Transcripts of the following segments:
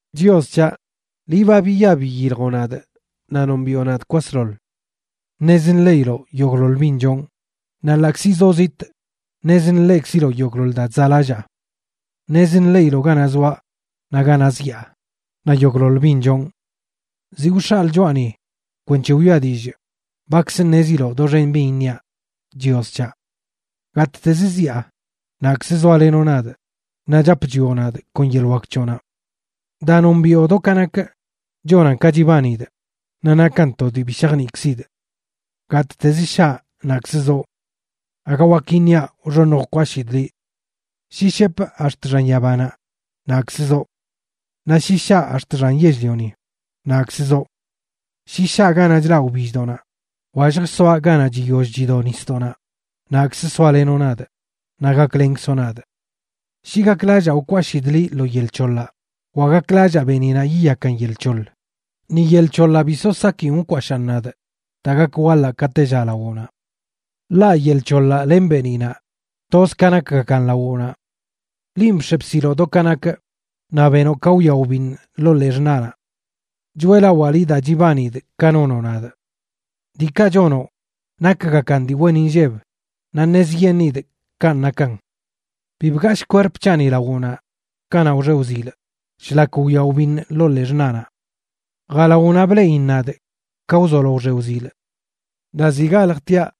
Chios c̱haꞌ, liꞌ ba biya biyiljoꞌ nadꞌ naꞌ nombiꞌo nadꞌ kwasḻoḻ. Ṉez nḻeꞌiloꞌ yogꞌḻoḻ bin chonꞌ; naꞌ ḻaꞌkzi zoꞌ zitꞌ, ṉez nḻeꞌkziloꞌ yogꞌḻoḻ daa chzaꞌlallaa. Ṉez nḻeꞌiloꞌ ganaꞌ zoaꞌ naꞌ ganaꞌ zyaa, naꞌ yogꞌḻoḻ bin chonꞌ. Ziꞌ wx̱aꞌlə choꞌani kwenc̱he wiꞌa dillꞌ, bakzə ṉeziloꞌ doxen bin iṉiaꞌ, Chios c̱haꞌ. Gattezə ziaꞌ, naꞌkzə zoalenoꞌ nadꞌ, naꞌ chap chwioꞌ nadꞌ kon yeḻꞌ wak c̱hoꞌnaꞌ. Daa nombiꞌo do ka nakꞌ chonan ka chibanidꞌ, naꞌ nakan to dii bi shajniꞌkzidꞌ. Gattez shaꞌ naꞌkzə zoꞌ. Aga wak iṉiaꞌ wxoṉj wkwashidꞌ liꞌ. Shi shepꞌ ax̱t xan yabanaꞌ, naꞌkzə zoꞌ. Naꞌ shi shaꞌ ax̱t xan yell-lioni, naꞌkzə zoꞌ. Shi shaꞌ ganaꞌ chlaꞌ wbilldoꞌnaꞌ, wa lljsoaꞌ ganaꞌ chiyoll chido nisdoꞌnaꞌ, naꞌkzə soalenoꞌ nadꞌ naꞌ gaklenkzoꞌ nadꞌ. Shi gaklallaa wkwashidꞌ liꞌ lo yel c̱hoḻaꞌ, wa gaklallaa beeniꞌnaꞌ yiyakan yel c̱hoḻ, ni yel c̱hoḻaꞌ bi so sakin wkwashaꞌn nadꞌ, daa gak waḻaꞌ ka tella lawoꞌnaꞌ. Ḻaꞌ yel c̱hoḻaꞌ len beeniꞌnaꞌ, toz ka nakgakan lawoꞌnaꞌ. Linꞌ bx̱e bsiloꞌ do ka nakꞌ, naꞌ benoꞌ ka wyaꞌ wbiṉꞌ ḻoo ḻee xṉaꞌnaꞌ. Choeꞌlawaa liꞌ daa chibanidꞌ ka nonoꞌ nadꞌ. Diikaꞌ chonoꞌ nakgakan dii wen inlleb, naꞌ ṉezyeṉidꞌ kanꞌ nakan. Bi bgashꞌ kwerp c̱haꞌni lawoꞌnaꞌ kanaꞌ wxe wzilꞌ, shlak wyaꞌ wbiṉꞌ ḻoo ḻee xṉaꞌnaꞌ. Jalawoꞌnaꞌ bleꞌin nadꞌ ka wzolo wxe wzilꞌ. Naꞌ ziꞌ galjtiaꞌ,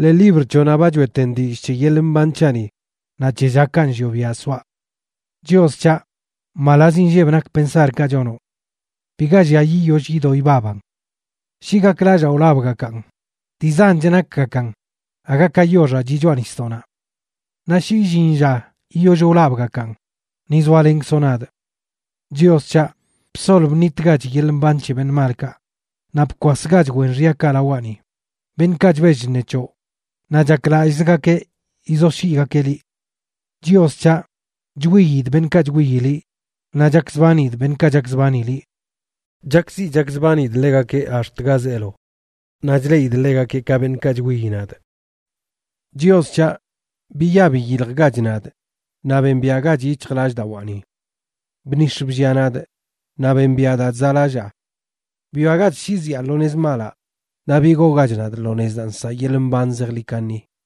ḻee libr c̱hoꞌnaꞌ ba choꞌeten dillꞌ c̱he yeḻꞌ mban c̱haꞌni naꞌ c̱he llakaꞌ nllioꞌ biaꞌ soaꞌ. ¡Chios c̱haꞌ, mbalaz inlleb nak pensarkaꞌ chonoꞌ! ¡Biga llia yiyoll yido ibaban! Shi gaklallaa wlabꞌgakan, dii zanch nakgakan aga ka yoxaꞌ chiꞌ choꞌa nisdoꞌnaꞌ. Naꞌ shi illin lla yiyoll wlabꞌgakan ni zoalenkzoꞌ nadꞌ. Chios c̱haꞌ, bsol bṉitgach yeḻꞌ mban c̱he beṉꞌ malkaꞌ, naꞌ bkwasgach wen xyakaꞌ lawaꞌni, beṉꞌkaꞌ chbell chṉe c̱hoꞌ naꞌ chaklallꞌzgakeꞌ yizoshyiꞌgakeꞌ liꞌ. Chios c̱haꞌ, chwiidꞌ beṉꞌkaꞌ chwiyi liꞌ, naꞌ chakzbanidꞌ beṉꞌkaꞌ chakzbani liꞌ. Chakziꞌ chakzbanidꞌ ḻegakeꞌ ax̱t ga zeelo, naꞌ chleꞌidꞌ ḻegakeꞌ ka beṉꞌkaꞌ chwiyi nadꞌ. Chios c̱haꞌ, biya biyiljgach nadꞌ, naꞌ bembiaꞌgach yic̱hjlallꞌdawaani. Bnix̱ bllia nadꞌ, naꞌ bembiꞌa daa chzaꞌlallaa. Bwiagach shi zyaa lo nez malaꞌ, naꞌ bigoogach nadꞌ lo nez daa nsaꞌ yeḻꞌ mban zejḻi kaṉi.